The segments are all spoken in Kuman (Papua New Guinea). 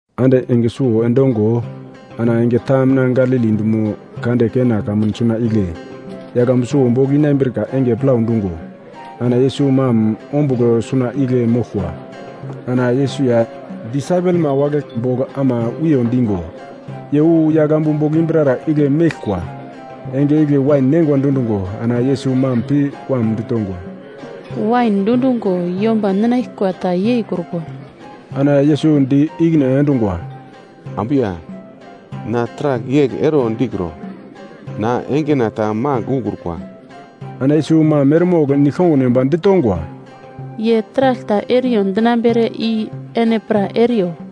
Ande enge suwo endongo ana enge ta mina Galili dumo kande Kena kamun suna igle yaglambu suwo bogl inambrika enge plau dungo, ana Yesus mam ombugl suna igle moglkwa. Ana Yesus ya disaipelma wagle bogl ama wiyo dingo, ye wu yaglambu bogl imbrara igle meglkwa. Enge igle wain neingwa dundungo, ana Yesus mam pi wam ditongwa, “Wain dundungo yomba ninaglkwa ta yeikrukwa.” Ana Yesus di ikine endungwa, “Ambu ya, na taragl yegl ero dikro, na engena ta magl ukrukwa.” Ana Yesus mam eremogl nigl-kongun yomba ditongwa, “Ye taragl ta eriyo dinambere i ene pra eriyo.”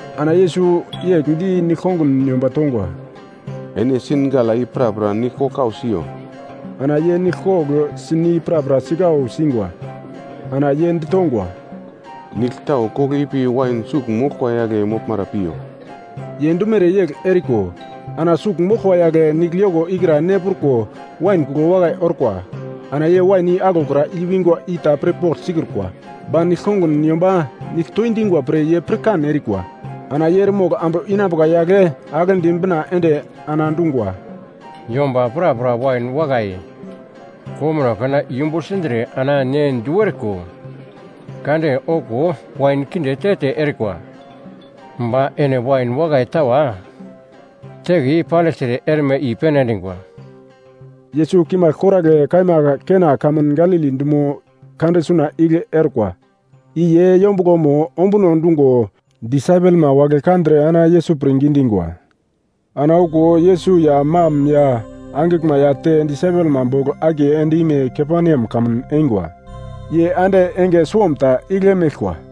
Ana Yesus yegl di nigl-kongun yomba tongwa, “Ene sin gala i prapra nigl kogl kau siyo.” Ana ye nigl kogl sin i prapra sikau singwa. Ana ye ditongwa, “Nigl tau kogl ipi wain sugl moglkwa yagle moglmara piyo.” Ye dumere yegl eriko, ana sugl moglkwa yagle nigl yoko ikra ne pruko wain kuglo wakai orkwa. Ana ye wain i aglokra i-wingwa i ta pirpogl sikrukwa, ba nigl-kongun yomba nigl toindingwa pre ye pirkan erikwa. Ana ye eremogl ambu inambuka yagle aglendi bina ende ana dungwa, “Yomba prapra wain wakai komuno kana yumbu sindre ana ne du eriko kade okuwo wain kinde te-te erikwa. Ba ene wain wakai tawa teke yei pandigltre erme i-pene endingwa.” Yesus kimagl koragle kaima Kena kamun Galili dumo kande suna igle orkwa, i ye yombuglomo ombuno dungo disaipelma wagle kandre ana Yesus pirngi dingwa. Ana okuwo Yesus ya mam ya angiglma ya te disaipelma bogl akiye end-ime Kaperneam kamun eingwa. Ye ande enge suwomta igle meglkwa.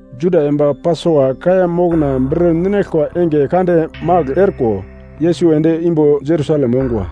Juda yomba Pasova kaiya mokna bir ninaglkwa enge kande magl orko. Yesus ende imbo Jerusalem ongwa.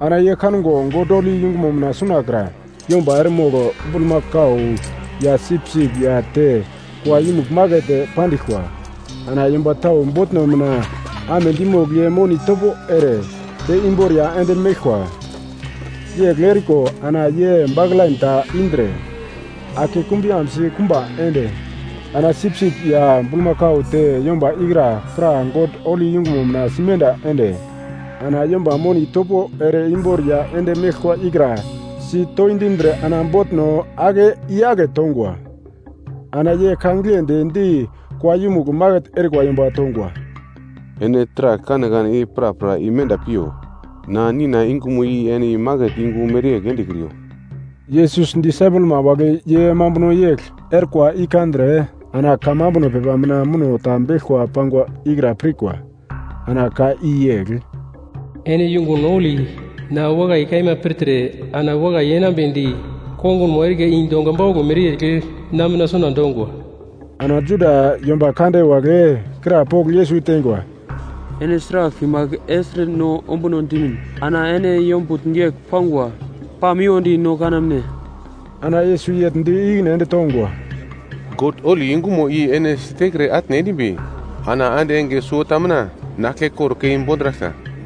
Ana ye kango God holi yungumo mina sunakra yomba eremogl bulmakau, ya sipsip ya te kua yumugl maket pandiglkwa. Ana yomba tau botno mina amedi mogl ye moni topo ere te imboriya ende meglkwa. Yegl eriko ana ye baklain ta indre ake kumbuyambsi kumba ende, ana sipsip ya bulmakau te yomba ikra pra God holi yungumo mina simenda ende, ana yomba moni topo ere imboriya ende meglkwa ikra sitoindindre ana botno ake i-yake tongwa. Ana ye ka giglendi di kua yumugl maket erikwa yomba tongwa, “Ene taragl kanekane i prapra imenda piyo! Na Nina yungumo i ene maket yungu mereyegl endekriyo!” Yesus disaipelma wagle ye mambuno yegl orkwa i kandre, ana kamambuno pepa mina muno ta beglko pangwa ikra pirkwa. Ana ka i yegl: ‘Ene yungun holi na wakai kaima pirtre ana wakai yenambedi kongunmo erika i donga bauglo mereyegl na mina suna dongwa.’ Ana Juda yomba kande wagle krapogl Yesus teingwa, “Ene sragl kimagl ertre no ombuno dimin ana ene yombutn yegl pangwa pamiwodi no kanamne?” Ana Yesus yegl di ikine ende tongwa, “God holi yungumo i ene siterke atne endimbi ana ande enge suwota mina na aglkekor kei bondraglka.”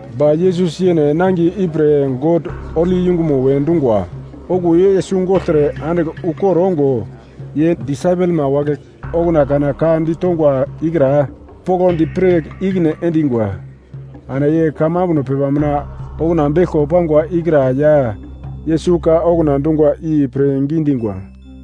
Ba Yesus yene nangiye ipre God holi yungumo we dungwa. Okuwo Yesus gogltre andigl ukor ongo, ye disaipelma wagle okuna kana ka ditongwa ikra poglodi pir ikine endingwa. Ana ye kamambuno pepa mina okuna beglko pangwa ikra ya Yesus ka okuna dungwa i pirngi dingwa.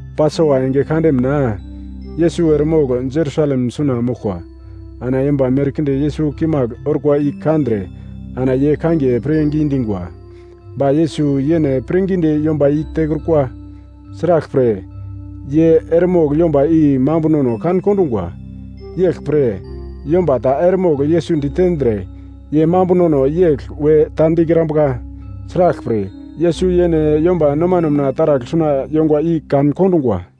Pasova enge kande mina, Yesus eremogl Jerusalem suna moglkwa, ana yomba merkinde Yesus kimagl orkwa i kandre ana ye kangiye pirngi dingwa. Ba Yesus yene pirngidi yomba i tekrukwa, sraglpre ye eremogl yomba i mambunono kan-kondungwa. Yeglpre yomba ta eremogl Yesus ditendre ye mambunono yegl we ta dikrambuka, sraglpre Yesus yene yomba nomano mina taragl suna yongwa i kan-kondungwa.